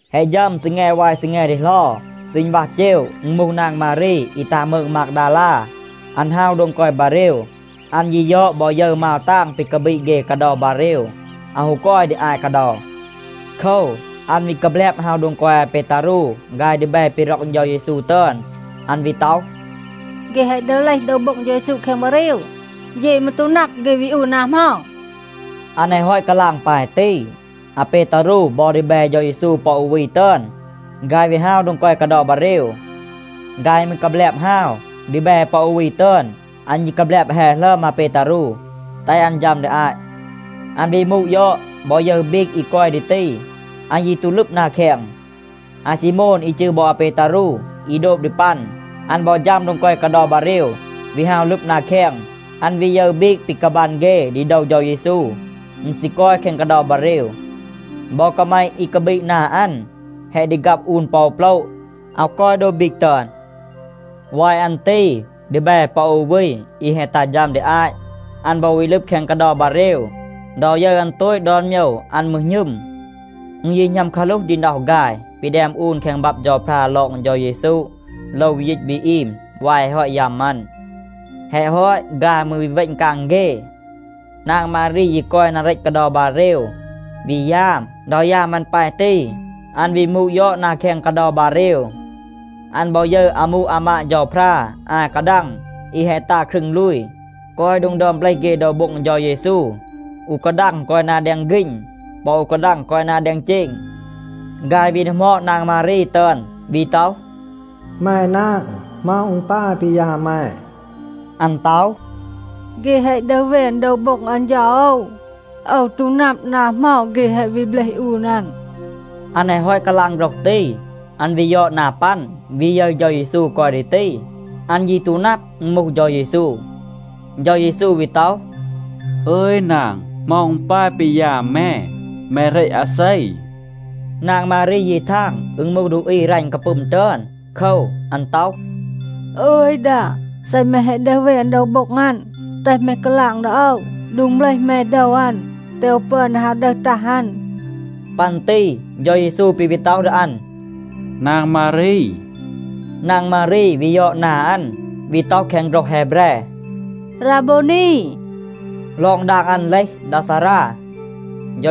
แฮะ ฌัม ซีแง วาย ซีแง ดีเหลา, ซีณวัห เจว อึณ มูห นาง มารี อี ตัห มืง มากดาลา, อัน ฮาว โดง กอย บาเรว. อัน ยี ยอด, บอ ยึร, มาว ตาง ปี กาบีด เฆ กาเดา บาเรว อาว ฮู กอย ดี อาต กาเดา. โคว, อัน วี กาแบลบ ฮาว โดง กอย อาเปตารู ฆาย ดีแบ ปี ร็อก เฌา เยซู ตึอน. อัน วี ต็อห, “เฆ แฮะ ดึห เลห โดว โบ็ง เฌา เยซู แคง บาเรว. เย มืร ตู นับ, เฆ วี อูน นา เหมา.” อัน แฮะ ฮอต กาลาง ปาย ตี, อาเปตารู บอ ดีแบ เฌา เยซู ปอ อู วี ตึอน, ฆาย วี ฮาว โดง กอย กาเดา บาเรว. ฆาย มืร กาแบลบ ฮาว. ดีแบ ปอ อู วี ตึอน, อัน ยี กาแบลบ แฮ หลึอม อาเปตารู แตห อัน ฌัม ดี อาต. อัน วี มูด ยอด, บอ ยึร บีก อี กอย ดี ตี. อัน ยี ตู ลึบ นา แคง. อาซีโมน อี จืร บอ อาเปตารู, อี โดบ ดี ปัน, อัน บอ ฌัม โดง กอย กาเดา บาเรว, วี ฮาว ลึบ นา แคง. อัน วี ยึร บีก ปี กาบัน เฆ ดี โดว เฌา เยซู, อึณ ซี กอย แคง กาเดา บาเรว. บอ กาแมะ อี กาบีด นา อัน แฮะ ดีฆับ อูน ปอ โปละ, อาว กอย โดบ บีก ตึอน. วาย อัน ตี ดีแบ ปอ อู วี, อี แฮะ ตัห ฌัม ดี อาต, อัน บอ วี ลึบ แคง กาเดา บาเรว. ดอ ยึร อัน โตต ดอน โมยว, อัน มืร หณึม. อึณ ยี หณัม กาหลูห ดี น็อห ฆาย ปี แดม อูน แคง บับ เฌาพรา ลอง เฌา เยซู โลว วี ยีต วี อีม วาย แฮะ ฮอต ยัม อัน. แฮะ ฮอต, ฆาย มืร วี เวณ กาง เฆ. นาง มารี ยี กอย นา เรต กาเดา บาเรว, วี ยาม. ดอ ยาม อัน ปาย ตี, อัน วี มูด ยอด นา แคง กาเดา บาเรว. อัน บอ ยึร อามู อามาด เฌาพรา อา กาดัง อี แฮะ ตา ครึง ลูย, กอย โดง ดึอม เบลห เฆ โดว โบ็ง เฌา เยซู. อู กาดัง กอย นา แดง ฆีณ. ปอ อู กาดัง กอย นา แดง เจณ. ฆาย วี ดีหมอด นาง มารี ตึอน, วี ต็อห, “แม นาง, เหมา อึณ ปาย ปี ยาม แม?” อัน ต็อห, “เฆ แฮะ ดึห แวน โดว โบ็ง อัน เฌา โอว. โอว ตู นับ นา เหมา เฆ แฮะ วี เบลห อูน อัน.” อัน แฮะ ฮอต กาลาง โฆรห ตี, อัน วี ยอด นา ปัน, วี ยึร เฌา เยซู กอย ดี ตี. อัน ยี ตู นับ, อึณ มูห เฌา เยซู. เฌา เยซู วี ต็อห, “อึย นาง, เหมา อึณ ปาย ปี ยาม แม? แม เหรต อาเซ?” นาง มารี ยี ทาง อึณ มูห ดูอี รัณ กาปึม ตึอน. โคว, อัน ต็อห, “อึย ดา, เซ แม แฮะ ดึห แวน โดว โบ็ง อัน, แตห แม กาลาง ดี โอว โดง เบลห แม โดว อัน, แตห โอว ปึอน ดี ฮาว ดึห ตัห อัน.” ปัน ตี เฌา เยซู ปี วี ต็อห ดี อัน, “นาง มารี.” นาง มารี วี ยอด นา อัน, วี ต็อห แคง โฆรห แฮแบร, “ราโบวนี.” ลอง ดาง อัน เลห, “ดา ซารา.”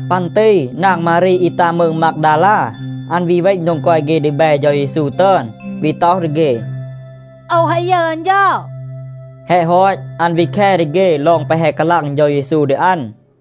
ปัน ตี นาง มารี อี ตัห มืง มากดาลา, อัน วี เวณ โดง กอย เฆ ดีแบ เฌา เยซู ตึอน, วี ต็อห ดี เฆ, “โอว แฮะ ยึร อัน เฌา.” แฮะ ฮอต, อัน วี แค ดี เฆ ลอง แปะ แฮะ กาลาง เฌา เยซู ดี อัน.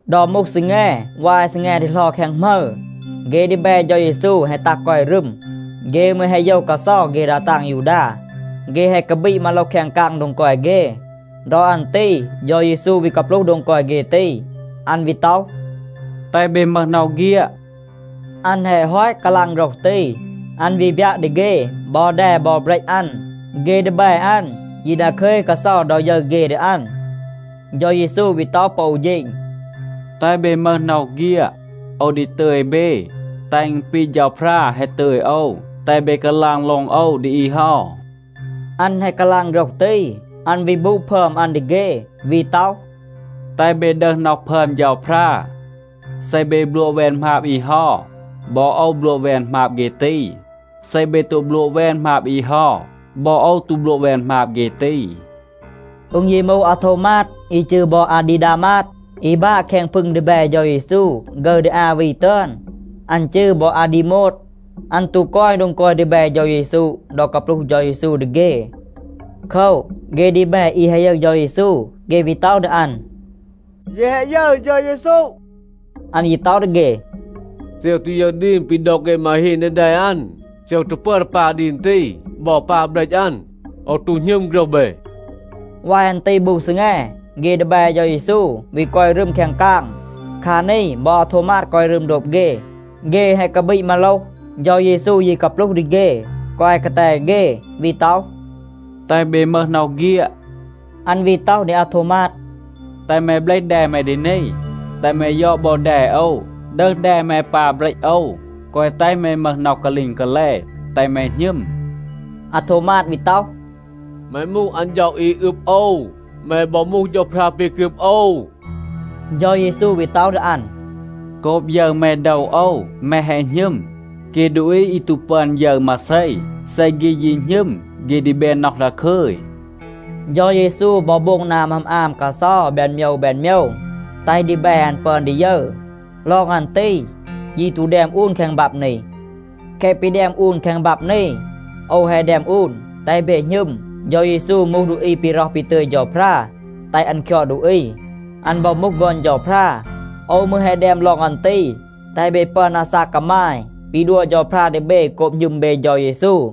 ดอ มูห ซีแง วาย ซีแง ดีเหลา แคง หมึร, เฆ ดีแบ เฌา เยซู แฮะ ตัห กอย รึม. เฆ มืร แฮะ โยว กาเซา เฆ ดา ตาง ยูดา. เฆ แฮะ กาบีด มาโลห แคง กาง โดง กอย เฆ. ดอ อัน ตี เฌา เยซู วี กาปลูห โดง กอย เฆ ตี. อัน วี ต็อห, “แตห เบ มึห น็อห เฆียด.” อัน แฮะ ฮอต กาลาง โฆรห ตี, อัน วี บยัะ ดี เฆ บอ แด บอ เบรต อัน. เฆ ดีแบ อัน ยี ดาคึย กาเซา ดอ ยึร เฆ ดี อัน. เฌา เยซู วี ต็อห ปอ อู เฌณ, “แตห เบ มึห น็อห เฆียด. โอว ดี ตึย เบ, แตห อึณ ปี เฌาพรา แฮะ ตึย โอว, แตห เบ กาลาง ลอง โอว ดี อี เฮา.” อัน แฮะ กาลาง โฆรห ตี, อัน วี บูด พึอม อัน ดี เฆ, วี ต็อห, “แตห เบ ดึห น็อห พึอม เฌาพรา. เซ เบ บลัวะ แวน หมาบ อี เฮา, บอ โอว บลัวะ แวน หมาบ เฆ ตี. เซ เบ ตู บลัวะ แวน หมาบ อี เฮา, บอ โอว ตู บลัวะ แวน หมาบ เฆ ตี.” อึณ ยี มูห อาโทวมาด, อี จืร บอ อาดีดามาด, อี บาะ แคง พึง ดีแบ เฌา เยซู ฆึร ดี อา วี ตึอน. อัน จืร บอ อาดีโมด. อัน ตู กอย โดง กอย ดีแบ เฌา เยซู ดอ กาปลูห เฌา เยซู ดี เฆ. โคว, เฆ ดีแบ อี แฮะ ยึร เฌา เยซู, เฆ วี ต็อห ดี อัน, “เย แฮะ ยึร เฌา เยซู.” อัน ยี ต็อห ดี เฆ, “เซ โอว ตู ยึร ดีม ปี ดอก เฆ มาฮีน ดี แด อัน, เซ โอว ตู ปึอน ดี ปา ดีม ตี บอ ปา เบรต อัน, โอว ตู หณึม โฆรห เบ.” วาย อัน ตี บู ซีแง, เฆ ดีแบ เฌา เยซู วี กอย รึม แคง กาง. คา นี บอ อาโทวมาด กอย รึม โดบ เฆ. เฆ แฮะ กาบีด มาโลห. เฌา เยซู ยี กาปลูห ดี เฆ, กอย กาแต เฆ, วี ต็อห, “แตห เบ มึห น็อห เฆียด.” อัน วี ต็อห ดี อาโทวมาด, “แตห แม เบลห แด แม ดี นี. แตห แม ยอด บอ แด โอว, ดึห แด แม ปา เบรต โอว. แกวะ แตห แม มึห น็อห กาลีง กาแล. แตห แม หณึม.” อาโทวมาด วี ต็อห, “แม มูห อัน เฌา, อี อึบ โอว, แม บอ มูห เฌาพรา ปี กรึบ โอว.” เฌา เยซู วี ต็อห ดี อัน, “โกบ ยึร แม โดว โอว, แม แฮะ หณึม. เฆ ดูอี อี ตู ปึอน ยึร มาเซ, เซ เฆ ยี หณึม, เฆ ดี แบน น็อห ดาคึย.” เฌา เยซู บอ โบง นา หมึอม อาม กาเซา แบน โมยว แบน โมยว, แตห ดีแบ อัน ปึอน ดี ยึร. ลอง อัน ตี ยี ตู แดม อูน แคง บับ นี. แคะ ปี แดม อูน แคง บับ นี, โอว แฮะ แดม อูน, แตห เบ หณึม, เฌา เยซู มูห ดูอี ปี ร็อห ปี ตึย เฌาพรา แตห อัน คยอด ดูอี. อัน บอ มูห ฆอน เฌาพรา. โอว มืร แฮะ แดม ลอง อัน ตี, แตห เบ ปึอน อาซาก กามาย ปี ดัว เฌาพรา ดี เบ โกบ หณึม เบ เฌา เยซู.